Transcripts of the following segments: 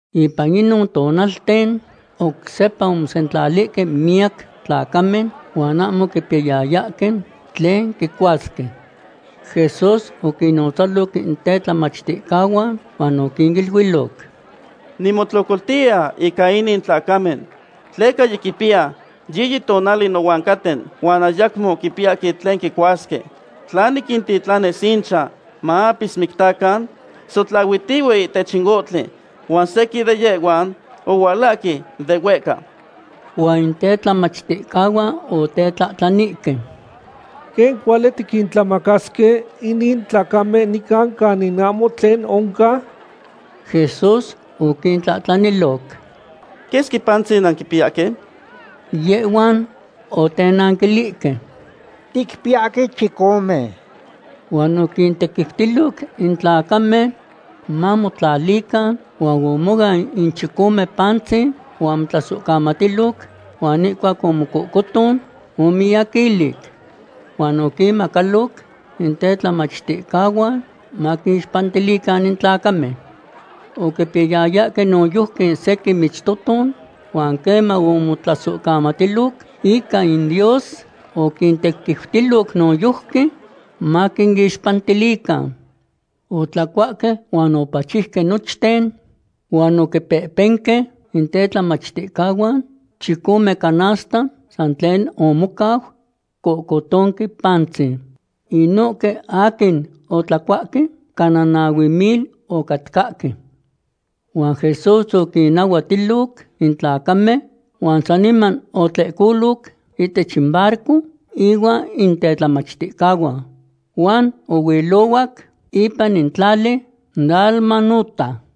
Ipan inon tonalten oc sepa omosentlalihque miyac tlacamen, huan ahmo oquipiyayahque tlen quicuasque. Jesús oquinnotzaloc in tetlamachticahuan huan oquiniluiloc: ―Nimotlocoltiya ica inin tlacamen tleca yiquipiya yiyi tonali nohuan caten huan ayacmo quipiyahque tlen quicuasque. Tla niquintitlanis inchan maapismicticacan, sotlahuitihue ihtech in ohtli, huan sequin de yehhuan ohualahque de huehca. Huan in tetlamachticahuan otetlahtlanihque: ―¿Quen cuali tiquintlamacasque inin tlacamen nican canin ahmo tlen oncan? Jesús oquintlahtlaniloc: ―¿Quesqui pantzin nanquipiyahque? Yehhuan otenanquilihque: ―Ticpiyahque chicome. Huan oquintequiutiloc in tlacamen mamotlalican huan omoan in chicome pantzin huan omotlasohcamatiloc, huan ihcuac omocohcoton, omiyaquilic. Huan oquinmacaloc in tetlamachticahuan maquinixpantilican in tlacamen. Oquipiyayahque noyojqui sequin michtoton, huan queman omotlasohcamatiloc ica in Dios, oquintequiutiloc noyojqui maquinixpantilican. Otlacuahque huan opachiuque nochten. Huan oquipehpenque in tetlamachticahuan chicome canasta san tlen omocau cohcotonque pantzin. Inohque aquin otlacuahque cana nahue mil ocatcahque. Huan Jesús oquinnahuatiloc in tlacamen huan saniman otlehcoloc ihtech in barco ihuan in tetlamachticahuan huan ohuilohuac ipan in tlali Dalmanuta.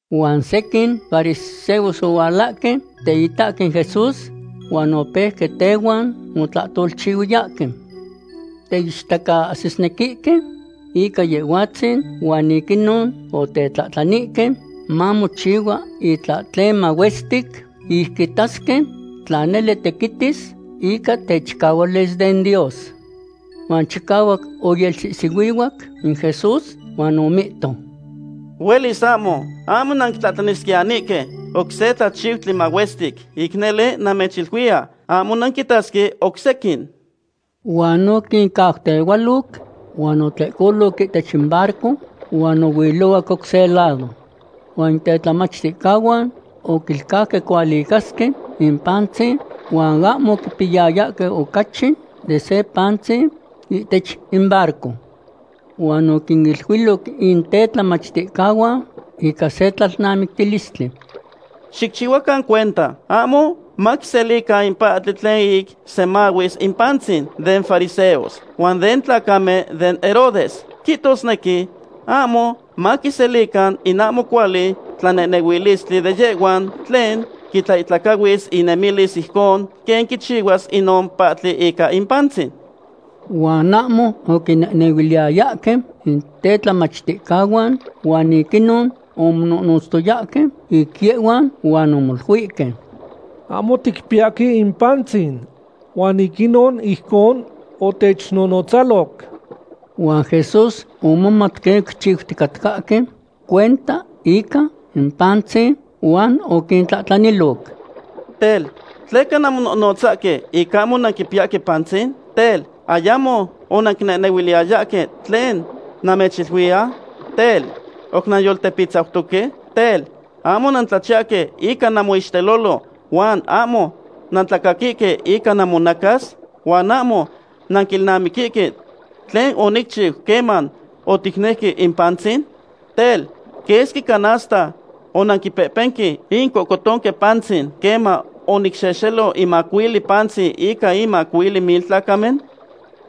Huan sequin fariseos ohualahque teitahque in Jesús huan opeuque tehuan motlahtolchihuiyahque. Teichtacaahsisnequihque ica Yehhuatzin huan ic inon otetlahtlanihque mamochihua itlahtlen mahuestic ic quitasque tla nele tequitis ica techicahualis den Dios. Huan chicahuac oyelsihsihuihuac in Jesús huan omihto: ―Huelis ahmo. Ahmo nanquitlahtlanisquiyanihque oc se tlachiutli mahuestic. Ic nele namechiluiya, ahmo nanquitasque oc sequin. Huan oquincautehualoc, huan otlehcoloc ihtech in barco huan ohuilohuac oc se lado. Huan in tetlamachticahuan oquilcauque cualicasque in pantzin, huan ahmo oquipiyayahque ocachi de se pantzin ihtech in barco. Huan oquiniluiloc in tetlamachticahuan ica se tlalnamictilistli: ―Xicchihuacan cuenta ahmo maquiselican in pahtli tlen ic semahuis in pantzin den fariseos huan den tlacamen den Herodes. Quihtosnequi ahmo maquiselican in ahmo cuali tlanehnehuilistli de yehhuan tlen quitlaihtlacahuis inemilis ijcon quen quichihuas inon pahtli ica in pantzin. Huan ahmo oquinehnehuiliyayahque in tetlamachticahuan huan ic inon omononotztoyahque ic yehhuan, huan omoluihque: ―Ahmo ticpiyahque in pantzin, huan ic inon ijcon otechnonotzaloc. Jesús omomat quen oquichiuticatcahque cuenta ica in pantzin, huan oquintlahtlaniloc: ―Tel, ¿tleca namononotzahque ic ahmo nanquipiyahque pantzin? Tel, ¿ayamo onanquinehnehuiliyayahque tlen namechiluiya? Tel, ¿oc nanyoltepitzautoque? Tel, ¿ahmo nantlachiyahque ica namoixtelolo, huan ahmo nantlacaquihque ica namonacas? ¿Huan ahmo nanquilnamiquihque tlen onicchiu queman oticnejque in pantzin? Tel, ¿quesqui canasta onanquipehpenque in cohcotonque pantzin queman onicxehxelo in macuili pantzin ica in macuili mil tlacamen?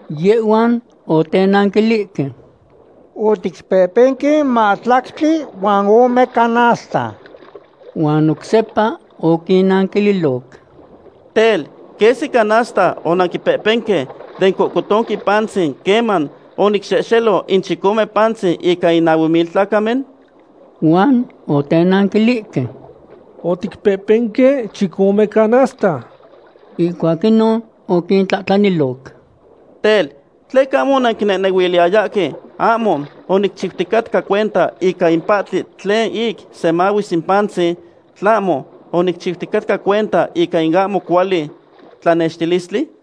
Yehhuan otenanquilihque: ―Oticpehpenque mahtlactli huan ome canasta. Huan oc sepa oquintlahtlaniloc: ―Tel, ¿quesqui canasta onanquipehpenque den cohcotonque pantzin queman onicxehxelo in chicome pantzin ica in nahue mil tlacamen? Huan otenanquilihque: ―Oticpehpenque chicome canasta. Ihcuac inon oquintlahtlaniloc: ―Tel, ¿tleca ahmo onanquinehnehuiliyayahque ahmo onicchiuticatca cuenta ica in pahtli tlen ic semahuis in pantzin, tlahmo onicchiuticatca cuenta ica in ahmo cuali tlanextilistli?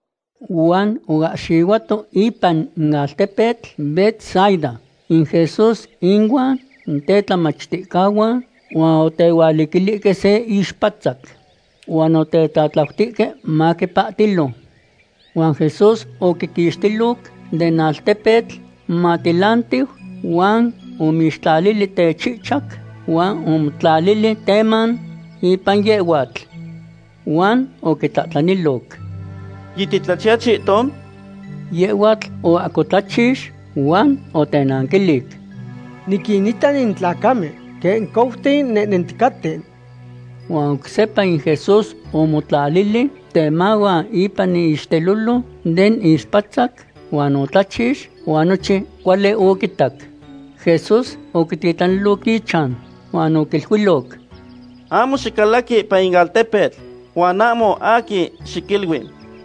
Huan oahxihuato ipan in altepetl Betsaida in Jesús inuan in tetlamachticahuan, huan otehualiquilihque se ixpatzac. Huan otetlatlautihque maquipahtilo. Huan Jesús oquiquixtiloc den altepetl momatilantiu, huan omixtlalili techihchac huan omotlalili teman ipan yehhuatl. Huan oquitlahtlaniloc: ―¿Yititlachiya chihton? Yehhuatl oahcotlachix huan otenanquilic: ―Niquinita in tlacamen quen couten nehnenticaten. Huan oc sepa in Jesús omotlalili temahuan ipan iixtelolo den ixpatzac huan otlachix huan nochin cuali oquitac. Jesús oquititlaniloc ichan huan oquiluiloc: ―Ahmo xicalaqui ipan in altepetl, huan ahmo aquin xiquilui.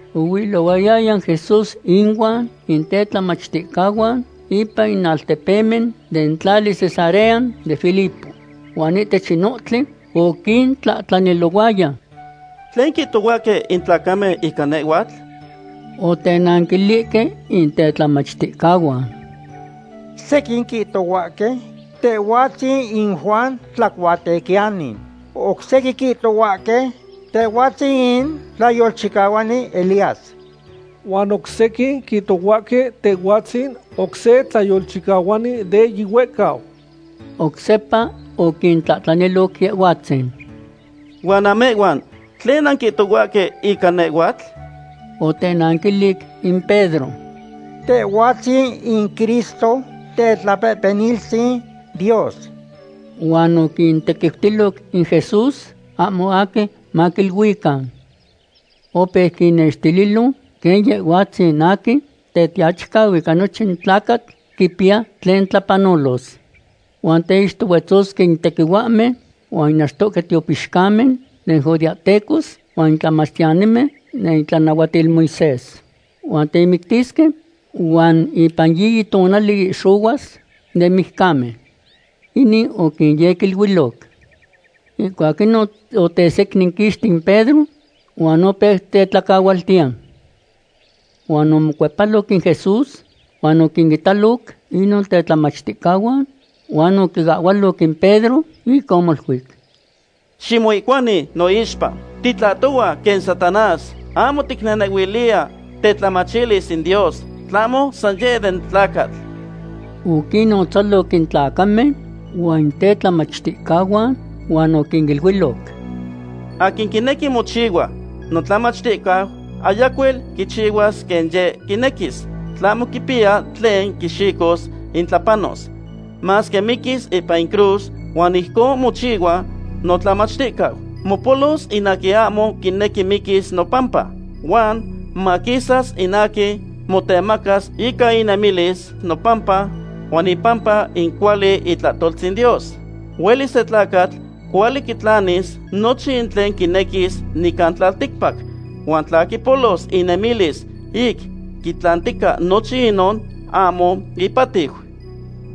Ohuilohuayaya in Jesús inuan in tetlamachticahuan ipan in altepemen den tlali Cesarea de Filipo. Huan ihtech in ohtli oquintlahtlanilohuaya: ―¿Tlen quihtohuahque in tlacamen ica nehhuatl? Otenanquilihque in tetlamachticahuan: ―Sequin quihtohuahque Tehhuatzin in Juan Tlacuatequiyani. Oc sequin quihtohuahque Tehhuatzin in tlayolchicahuani Elías, huan oc sequin quihtohuahque Tehhuatzin oc se tlayolchicahuani de yihuehcau. Oc sepa oquintlahtlaniloc Yehhuatzin. ―¿Huan namehhuan, tlen nanquihtohuahque ica nehhuatl? Otenanquilic in Pedro: ―Tehhuatzin in Cristo, Tetlapehpeniltzin Dios. Huan oquintequiutiloc in Jesús ahmo aquin maquiluican. Opeu quinextililo quen Yehhuatzin aquin Tetiachicau ica nochin tlacatl quipiya tlen tlapanolos. Huan teixtohuetzosque in tequihuahmen huan in achtohque tiopixcamen den judeahtecos huan in tlamachtiyanimen den itlanahuatil Moisés. Huan temictisque, huan ipan yiyi tonali ihxohuas den mijcamen. Inin oquinyequiluiloc. Ihcuac inon otesecninquixti in Pedro huan opeu tetlacahualtiya. Huan omocuepaloc in Jesús huan oquinitaloc inon tetlamachticahuan, huan oquiahhualoc in Pedro, ic omoluic: ―¡Ximoihcuani noixpa! ¡Titlahtohua quen Satanás! Ahmo ticnehnehuiliya tetlamachilis in Dios, tlahmo san yeh den tlacatl. Oquinnotzaloc in tlacamen huan in tetlamachticahuan huan oquiniluiloc: ―Aquin quinequi mochihua notlamachticau ayacuel quichihuas quen yeh quinequis. Tlahmo quipiya tlen quixicos ic tlapanos, masque miquis ipan in cruz, huan ijcon mochihua notlamachticau. Mopolos in aquin ahmo quinequi miquis nopampa, huan maquisas in aquin motemacas ica inemilis nopampa huan ipampa in cuali itlahtoltzin Dios. Huelis se tlacatl cuali quitlanis nochin tlen quinequis nican tlalticpac. Huan tla quipolos inemilis ic quitlantica nochin inon, ahmo ipahtiu.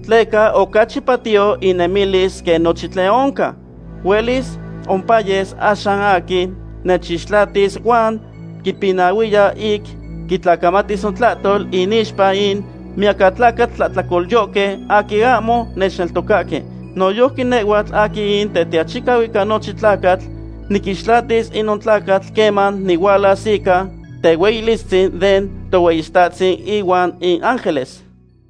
Tleca ocachi patiyo inemilis quen nochin tlen oncan. Huelis ompayes axan aquin nechixtlatis huan quipinahuiya ic quitlacamatis notlahtol inixpa in miyacatlacatl tlahtlacolyohque aquin ahmo nechneltocahque. Noyojqui nehhuatl aquin in Tetiachicau ica nochin tlacatl niquixtlatis inon tlacatl queman nihualas ica tehueyilistzin den Tohueyitahtzin ihuan in ángeles.